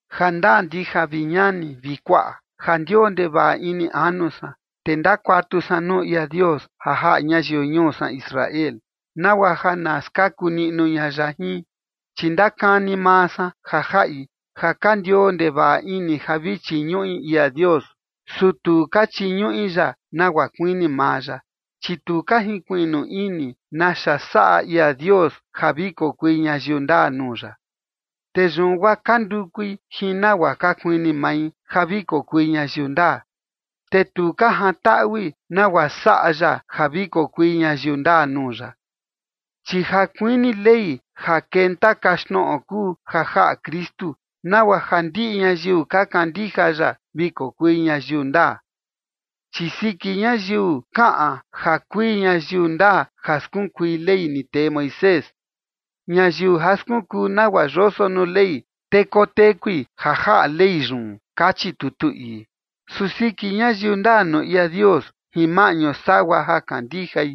Jandaa ndija, vi ñani vi kuaꞌa, ja ndioo ndevaꞌa ini anu san, te ndakuatu san nuu ia Dios ja jaꞌa ñayiu ñuu san Israel nagua ja na skaku niꞌnu ña ya jin. Chi ndakani maa san ja jaꞌi ja ka ndioo ndevaꞌa ini ja vi chiñuꞌi ia Dios, su tu ka chiñuꞌi ya nagua kuini maa ya. Chi tu ka jinkuiꞌnu ini naxa saꞌa ia Dios ja vi kokui ñayiu ndaa nuu ya, te yun guaa ka ndukui jin nagua ka kuini mai ja vi kokui ñayiu ndaa, te tu ka jantaꞌui nagua saꞌa ya ja vi kokui ñayiu ndaa nuu ya. Chi ja kuini Ley ja kenta kaxtnoꞌo kuu ja jaꞌa Kristu, nagua ja ndiꞌi ñayiu ka kandija ya vi kokui ñayiu ndaa. Chi siki ñayiu kaꞌan ja kui ñayiu ndaa ja skunkui Ley, ni tee Moisés: “Ñayiu ja skunkuu nagua yoso nuu Ley, te kotekui ja jaꞌa Ley yun”, kachi tutu ii. Su siki ñayiu ndaa nuu ia Dios jin maꞌñu sagua ja kandijai,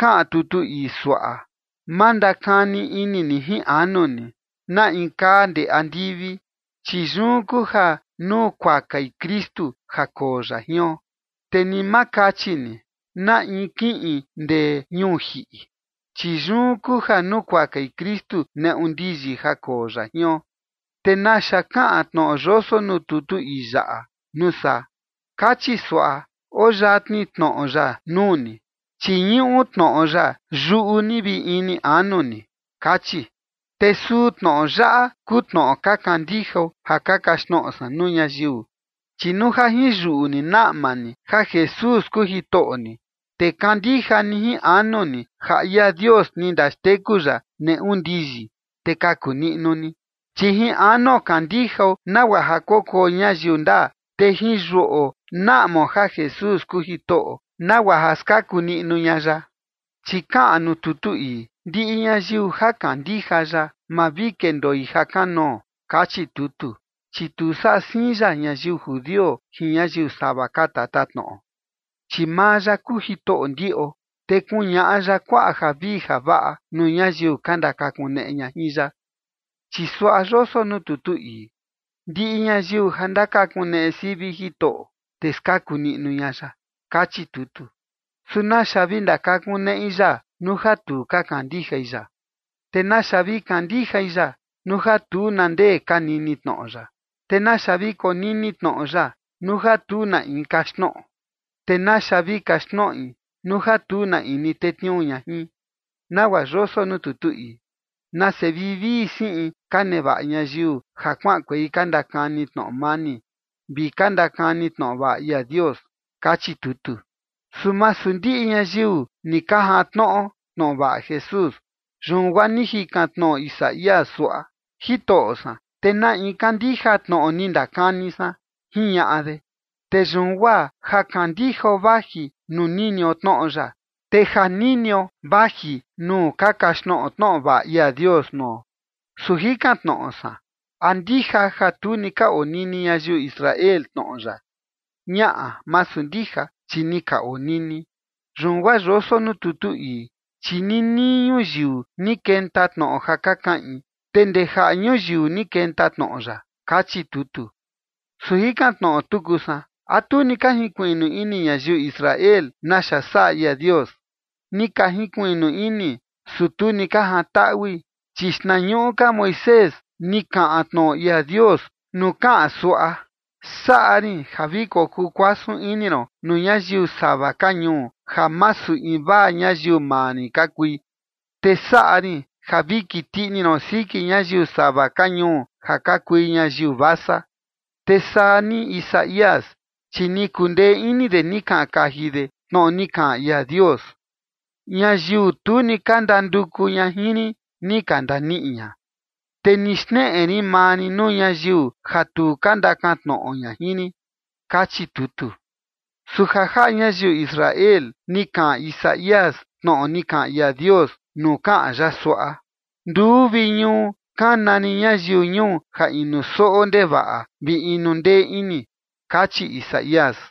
kaꞌan tutu ii suaꞌa: “Ma ndakani ini ni jin anu ni: ¿Na in kaa ndee andivi?” Chi yun kuu ja nukuakai Kristu ja koo ya jion. Te ni ma kachi ni: “¿Na in kiꞌin ndee ñuu jiꞌi?” Chi yun kuu ja nukuakai Kristu neꞌu ndiyi ja koo ya jion. ¿Te naxa kaꞌan tnoꞌo yoso nuu tutu ii yaꞌa, nuu saa? Kachi suaꞌa: “Oo yatni tnoꞌo ya nuu ni, chi ñuꞌu tnoꞌo ya yuꞌu ni vi ini anu ni”, kachi. Te suu tnoꞌo yaꞌa kuu tnoꞌo ka kandijao ja ka kaxtnoꞌo san nuu ñayiu. Chi nuu ja jin yuꞌu ni naꞌma ni ja Jesús kuu Jitoꞌo ni, te kandija ni jin anu ni ja ia Dios ni ndaxteku ya neꞌu ndiyi, te kaku niꞌnu ni. Chi jin anuo kandijao nagua ja kokuo ñayiu ndaa, te jin yuꞌo naꞌmao ja Jesús kuu Jitoꞌo, nagua ja skaku niꞌnu ña ya. Chi kaꞌan nuu tutu ii: “Ndiꞌi ñayiu ja kandija ya, ma vi kendoi ja kanoo”, kachi tutu. Chi tu saꞌa siin ya ñayiu judio jin ñayiu sava ka tatatnoꞌo, chi maa ya kuu Jitoꞌo ndiꞌo, te kuñaꞌa ya kuaꞌa javii javaꞌa nuu ñayiu ka ndakakuneꞌe ña jin ya. Chi suaꞌa yoso nuu tutu ii: “Ndiꞌi ñayiu ja ndakakuneꞌe sivi Jitoꞌo, te skaku niꞌnu ña ya”, kachi tutu. Su ¿naxa vi ndakakuneꞌi ya nuu ja tu ka kandijai ya? ¿Te naxa vi kandijai ya nuu ja tu na ndee ka nini tnoꞌo ya? ¿Te naxa vi konini tnoꞌo ya nuu ja tu na in kaxtnoꞌo? ¿Te naxa vi kaxtnoꞌi nuu ja tu na in tetniuu ña jin? Nagua yoso nuu tutu ii: “¡Nase vivii siꞌin ka nevaꞌa ñayiu ja kuaꞌankuei ka ndakani tnoꞌo mani vi ka ndakani tnoꞌo vaꞌa ia Dios!”, kachi tutu. Su masu ndiꞌi ñayiu ni ka jantnoꞌo tnoꞌo vaꞌa Jesús. Yun guaa ni jikan tnoꞌo Isaías suaꞌa: “Jitoꞌo san, ¿te na in kandija tnoꞌo ni ndakani san?” jiñaꞌa de. Te yun guaa ja kandijao vaji nuu ninio tnoꞌo ya, te ja ninio vaji nuu ka kaxtnoꞌo tnoꞌo vaꞌa ia Dios nuo. Su jikan tnoꞌo san, ¿a ndija ja tu ni ka onini ñayiu Israel tnoꞌo ya? Ñaꞌa, masu ndija, chi ni ka onini. Yun guaa yoso nuu tutu ii: Chi ninii ñuyiu ni kenta tnoꞌo ja ka kaꞌin, te ndee jaꞌa ñuyiu ni kenta tnoꞌo ya, kachi tutu. Su jikan tnoꞌo tuku san: ¿A tu ni ka jinkuiꞌnu ini ñayiu Israel naxa saꞌa ia Dios? Ni ka jinkuiꞌnu ini, su tu ni ka jantaꞌui, chi xtnañuꞌu ka Moisés ni kaꞌan tnoꞌo ia Dios nuu kaꞌan suaꞌa: Saꞌa rin ja vi kokuu kuasun ini ron nuu ñayiu sava ka ñuu ja masu invaa ñayiu maa rin ka kui, te saꞌa rin ja vi kiti ini ron siki ñayiu sava ka ñuu ja ka kui ñayiu vasa. Te saa ni Isaías, chi ni kundee ini de ni kaꞌan kaji de tnoꞌo ni kaꞌan ia Dios: Ñayiu tu ni ka ndanduku ña jin rin, ni ka ndaniꞌi ña, te ni xneꞌe rin maa rin nuu ñayiu ja tu ka ndakan tnoꞌo ña jin rin, kachi tutu. Su ja jaꞌa ñayiu Israel ni kaꞌan Isaías tnoꞌo ni kaꞌan ia Dios nuu kaꞌan ya suaꞌa: “Nduu vi ñuu kana rin ñayiu ñuu ja inu soꞌo ndevaꞌa vi inu ndee ini”, kachi Isaías.